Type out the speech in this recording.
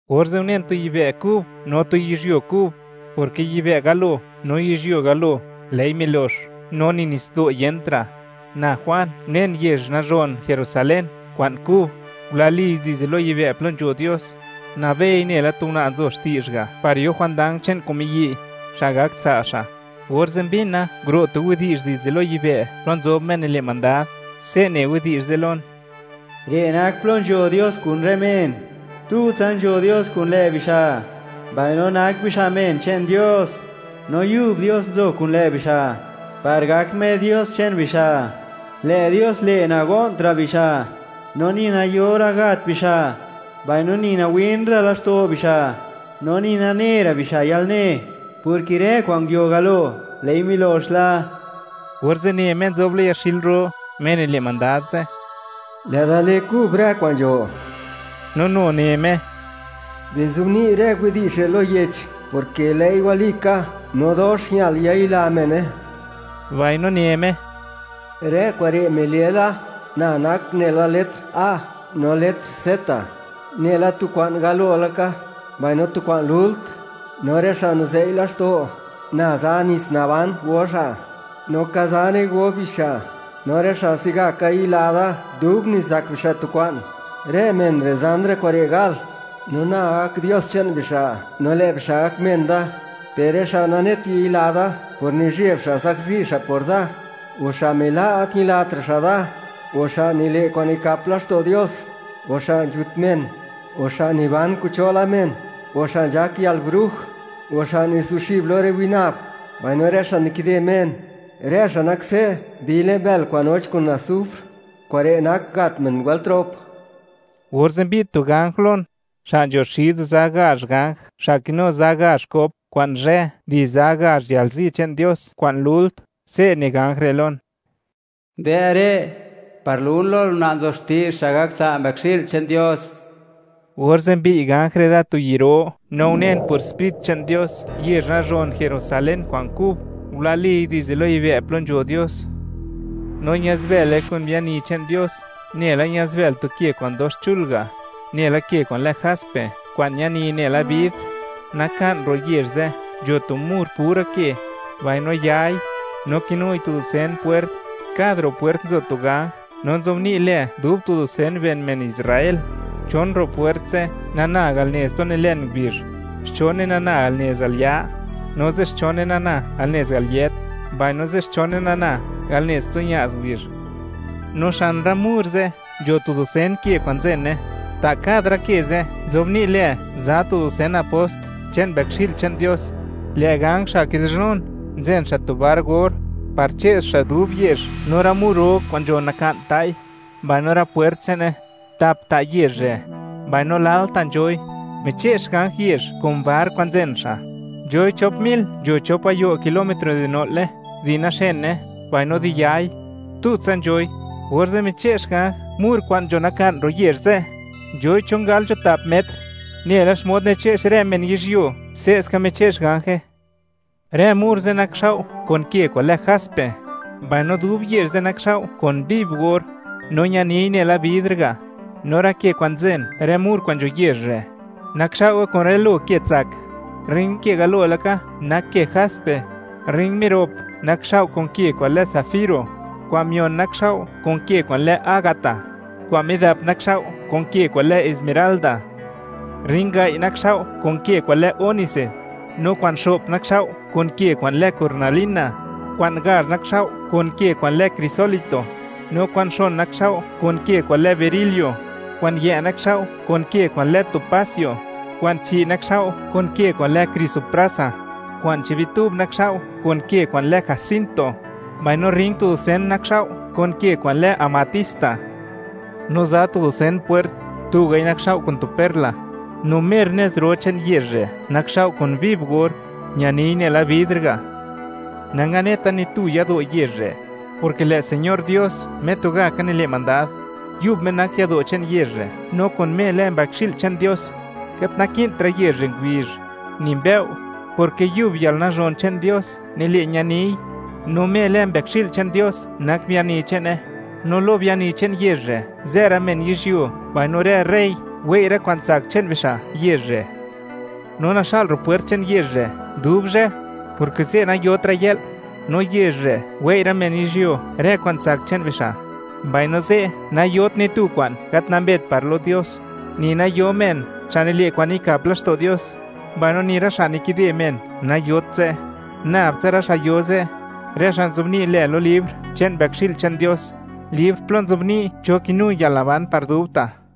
Orze' unen tu yibë' kub no tu yizhyuo kub, porke yibë' galo no yizhyuo galo, lë'i milox, no ni nitsdo' yentra'. Na Juan, unen yezh nazhon Jerusalén kwa'n kub, ngulaliy dizde lo yibë' plo nzho Dios; nabei nela tu una' nzo xti'zh ga' par yo jwandang che'n kun miyi' xa' gak tsa' xa'. Orze' mbina nguro' tu widi'zh dizde lo yibë', plo nzob Me nile' mandad, se' ne widi'zh ze' lon: ―Re' nak plo nzho Dios kun rë men; tutsa nzho Dios kun lë' bixa', mbaino nak bixa' men che'n Dios, no Yub Dios nzo kun lë' bixa', par gak Me Dios che'n bixa'. Lë' Dios le', nago'ntra' bixa', no ni nayora' gat bixa'; mbaino ni nawin ra' laxto' bixa', no ni nane ra' bixa' yalne, porke rë kwa'n nguio galo, lë'i milox la. Orze' ne Me nzob lo yaxil ro, Me nile' mandad ze': ―Lë' Da le kub rë kwa'n nzho. No nu ne Me: ―Bizobni' rë widi'zh re' lo yech, porke lë'i walika, no dox ñal yayila mene. Mbaino ne Me: ―Rë kure' mile la: Na nak nela letr A no letr Z; nela tu kwa'n galo laka, mbaino tu kwa'n lult. No rë xa' nizei' laxto', Na za nits naban go xa', no ka zane go bixa'. No rë xa' se'gaka yila Da dub nizak bixa' tu kwa'n, rë men re' zan rë kure' gal; no Na gak Dios che'n bixa', no lë' bixa' gak men da. Per rë xa' nanet yila Da por nizheb xa' zakzi xa' por Da, o xa' mila' gat ñilatra' xa' Da, o xa' nile' kwa'n nikap laxto' Dios, o xa' nzhut men, o xa' niban kun cho la men, o xa' nzhak yalbruj, o xa' nizuxib lo rë winab, mbaino rë xa' nikide men; rë xa' nak se' bi le'n bël kwa'n noch kun asufr; kure' nak gat men wëlt rop. Orze' mbi'd tu ganj lon, xa' nzho xid za gazh ganj xa' kinu za gazh kop kwa'n zhë di za gazh yalzi che'n Dios kwa'n lult, se' ne ganj re' lon: ―Dë' re', par lun lol una' nzo xti'zh xa' gak tsa' Mbëkxi'l che'n Dios. Orze' mbi'y ganj re' da tu yi' ro, no unen por Sprit che'n Dios, yezh nazhon Jerusalén kwa'n kub, ngulaliy dizde lo yibë' plo nzho Dios. No ña'zbële kun biani che'n Dios, nela ña'zbël tu ke kwa'n dox chul ga', nela ke kwa'n lë jaspe, kwa'n ñani nela bidr. Naka'n ro' yezh ze' nzho tu mur pura ke, mbaino yai, no kinui tu dusen pwert; kad ro' pwert nzo tu ganj, no nzobni' lë dub tu dusen ben men Israel. Chon ro' pwert ze' nana al nez plo nilen ngubizh, xchone nana al nez al ya', no zixchone nana al nez al yët, mbaino zixchone nana al nez plo ña'z ngubizh. No xan rë mur ze' nzho tu dusen ke kwa'n nzene; ta' tuga' rë ke ze' nzobni' lë, za tu dusen apost che'n Mbëkxi'l che'n Dios. Lë' ganj xa' kidi'zhnun, nzen xa' tu bar or, par che'x xa' dub yezh, no rë mur ro kwa'n nzho naka'n ta'i, mbaino rë pwert che'ne. Tap ta' yezh re', mbaino lal ta' nzhoi. Miche'x ganj yezh kun bar kwa'n nzen xa': nzhoi chop mil nzho chop gayo' kilómetro di no'le, di naxene, mbaino di yai; tutsa nzhoi. Orze' miche'x ganj mur kwa'n nzho naka'n ro' yezh ze', nzhoi, chon gal nzho tap metr; nela xmod niche'x rë men yizhyuo, se'ska miche'x ganje. Rë mur ze' nakxao' kun ke kwa'n lë jaspe, mbaino dub yezh ze' nakxao' kun viv or, no ñaniy nela bidr ga'. No rë ke kwa'n nzen rë mur kwa'n nzho yezh re', nakxao'we kun rë lo ke tsak; rrin ke galo laka nak ke jaspe, rrin mirop nakxao' kun ke kwa'n lë zafiro, kwa'n mion nakxao' kun ke kwa'n lë ágata, kwa'n midap nakxao' kun ke kwa'n lë esmeralda; rrin gai' nakxao' kun ke kwa'n lë ónice, no kwa'n xo'p nakxao' kun ke kwa'n lë cornalina, kwa'n gazh nakxao' kun ke kwa'n lë crisólito, no kwa'n xon nakxao' kun ke kwa'n lë berilio, kwa'n yë' nakxao' kun ke kwa'n lë topacio, kwa'n chi' nakxao' kun ke kwa'n lë crisoprasa, kwa'n chi' bitub nakxao' kun ke kwa'n lë jacinto, mbaino rrin tu dusen nakxao' kun ke kwa'n lë amatista. No za tu dusen pwert, tugai nakxao' kun tu perla; no mer nez ro che'n yezh re' nakxao' kun viv or, ñani nela bidr ga'. Nanganeta ni tu yado' yezh re', porke lë' Señor Dios, Me tugaka nile' mandad, yub Me nak yado' che'n yezh re', no kun Me lë Mbëkxi'l che'n Dios. Gat naki'ntra' yezh re' ngubizh ni mbëo', porke yub yalnazhon che'n Dios nile' ñaniy; no Me lë Mbëkxi'l che'n Dios nak biani che'ne. No lo biani che'n yezh re', zë rë men yizhyuo; mbaino rë rey wei' rë kwa'n tsak che'n bixa' yezh re'. No naxa'l ro' rë pwert che'n yezh re' dub zhë, porke ze' nayotra' yë'l. No yezh re', wei' rë men yizhyuo, rë kwa'n tsak che'n bixa'. Mbaino ze' nayot ni tu kwa'n gat nambet par lo Dios, ni nayo men xa' nile' kwa'n nikap laxto' Dios, mbaino ni rë xa' nikide men nayot ze'; nab tsa rë xa' yo ze', rë xa' nzobni' lë lo libr che'n Mbëkxi'l che'n Dios, libr plo nzobni' cho kinu yalnaban par dubta'.